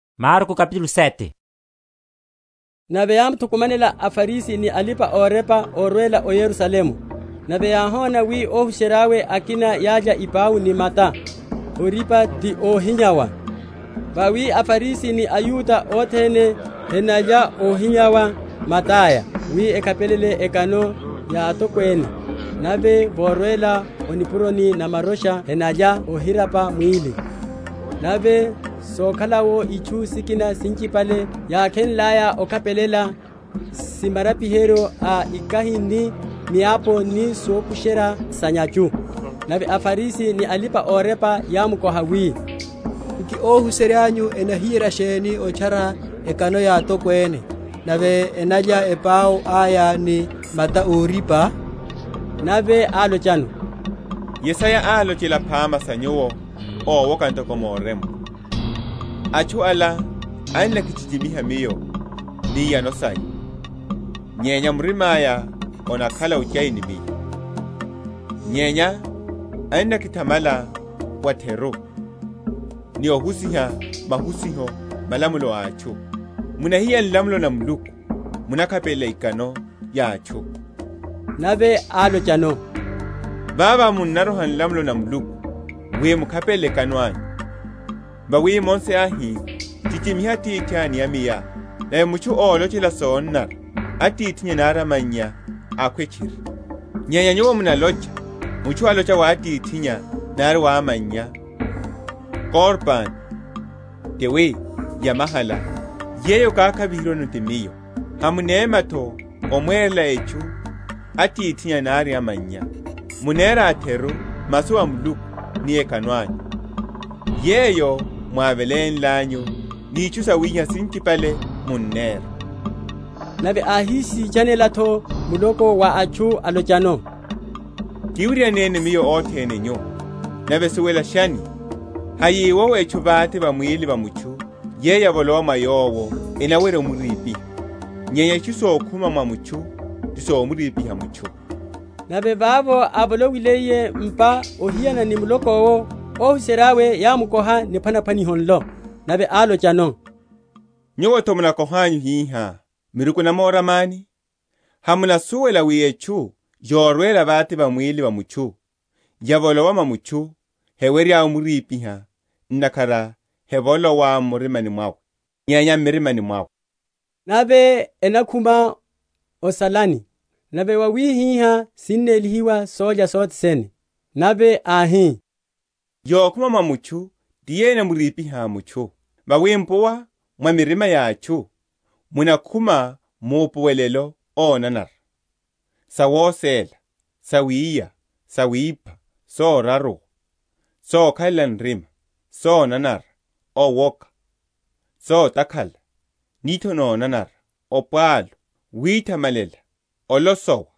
Ikano sa makholo aya. Nave yámuthukumanela aFarisi ni alipa‐orepa, órwela o Yerusalemu, nave yáhona wi óhuserya’we akina yálya ipau ni mata órípa, ti óhinyawa. Vawi aFarisi ni aYuda othene henalya óhinyawa mata’ya, wi ekhapelele ekano ya atokwene; nave vorwela o nipuroni na marocha henalya óhirapa mwíli; nave sokhala’wo itchu sikina sinchipale yákhenlaya okhapelela, si marapiheryo a ikahi ni miapu ni sokusherya sa’nyachu. Nave aFarisi ni alipa‐orepa yámkoha wi, Nki óhuserya’nyu enahiyerya sheni otchara ekano ya atokwene nave enalya epau aya ni mata órípa? Nave álochano, Yesaya álochela phama sa nyuwo ówoka ntoko morempwa, Atchu ala enakichichimiha Miyo ni iyano saya, Nyenya murima’ya onakhala ochai ni Miyo. Nyenya enakithamala wa’theru, Ni ohusiha mahusiho, malamulo a atchu. Munahiya nlamulo na Muluku, munakhapelela ekano ya atchu. Nave álochano, Vavo munaroha nlamulo na Muluku wi mukhapelele ekano anyu. Vawi Mose áhi, Chichimiha atithá ni amayá, nave mutchu ólochela sonanara atithinnya nari amannya, akhwe tchiri: nyenya nyuwo munalocha, Mutchu alocha wa atithinnya nari wa amannya, Korban, ti wi yamahala, yeyo okakhaviheryiwano ti miyo, hamunemya’tho omwerela etchu atithinnya nari amannya. Munera a’theru masu a Muluku ni ekano anyu, yeyo mwávelenlanyu; ni itchu sawihiha sinchipale munnera. Nave áhisitchanela’tho muloko wa atchu, alochano, Kiwiryaneni Miyo othene nyu, nave suwelashani; hayiwowo etchu vate va mwíli wa mutchu yeyo yavolowa mwa yowo, énawerya omurípiha; nyenya itchu sokhuma mwa mutchu ti somuripiha mutchu. Nave vavo ávolowiliye m’pa ohiyana ni muloko’wo, óhuserya’we yámukoha niphwanaphwaniho nlo. Nave álochano, Nyuwo’tho munakohanyu hihá, miruku enamoramani? Hamunasuwela wi etchu yorwela vate va mwíli wa mutchu, yavolowa mwa mutchu, hewerya omurípiha; ntakhara hevolowa m’murimani mwawe, nyenya m’mirimani mwawe, nave enakhuma o salani, nave wawihihá sinnélihiwa sólya sothene. Nave áhi, Yokhuma mwa mutchu ti yeyo enamuripiha mutchu. Vawi m’puwa mwaya mwa mirima ya atchu, munakhuma maupuwelo ónanara, sawosela, sawiya, sawipha, soraruwa, sokhalela nrima, sonanara, owoka, sotakhala, nitho nonanara, opwalu, oithamalela, olosowa;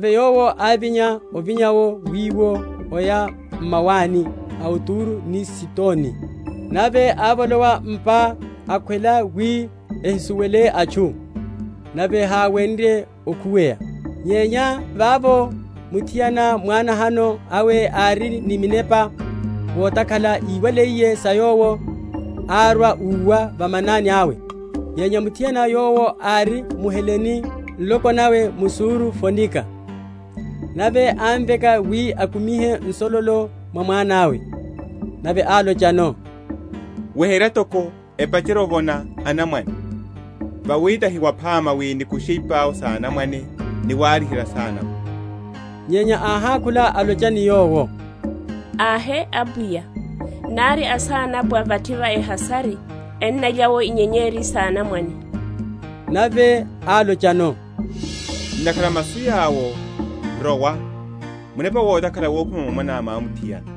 Nave Yowo ávinya, avinya’wo wiwo, aya m’mawani a Turo ni Sidoni. Nave ávolowa m’pa, akhwela wi ehisuwele atchu; nave háwenrye okhuweya. Nyenya vavo muthiana, mwá‐nahano awe ári ni munepa wotakhala, íwaliye sa Yowo, árwa, úwa va manani awe. Nyenya muthiana yowo ári mHelene nloko nawe mSuro‐Fonika. Nave ámveka wi akumihe nsololo mwa mwana’we. Nave álochano, Weherya toko, epacherye ovona anamwane; vawi tahi waphama wi nikushe ipau s’anamwane ni warihela asanapwa. Nyenya áhákhula alocha ni Yowo, Ahe, Apwiya; nari asanapwa vathi va ehasari, ennalya’wo inyenyeri s’anamwane. Nave álochano, Ntakhara a masu yawo, rowa; munepa wotakhala wokhuma mwa mwaná mwamuthiana.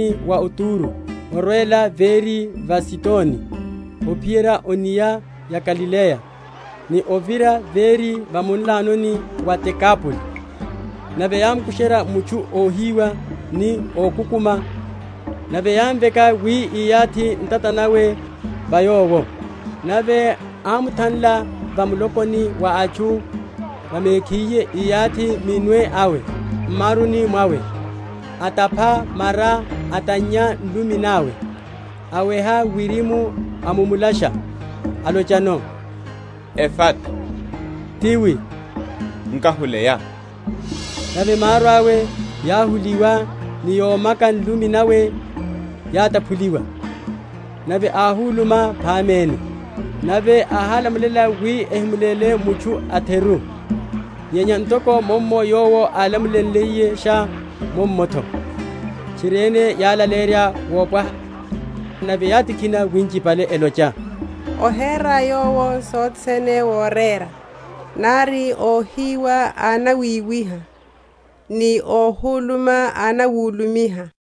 Nave ákhuma’tho m’munlanoni wa Turo, arwela véri va Sidoni, ophiyerya o’nia ya Galileya, ni ovira véri va munlano wa Dekapoli. Nave yámukusherya mutchu óhiwa ni ókukuma; nave yámveka wi iyathi ntata nawe va yowo. Nave ámuthanla va mulokoni wa atchu, va mekhiye, íyathi minwe awe m’maruni mwawe, atapha mara, atannya nlumi nawe; awcha wirimu, amumulasha, alochano, Efata, ti wi, Nkahuleya. Nave maru awe yáhuliwa, ni yomaka nlumi nawe yátaphuliwa, nave áhuluma phamene. Nave áhálamulela wi ehimulele mutchu a’theru; nyenya ntoko mummo Yowo álamulenliyesha, mummo’tho tchiriene yálaleyerya wopwaha. Nave yátikhina winchipale, elocha, Ohera Yowo sothene worera; nari óhiwa annawiwiha ni óhuluma annawulumiha.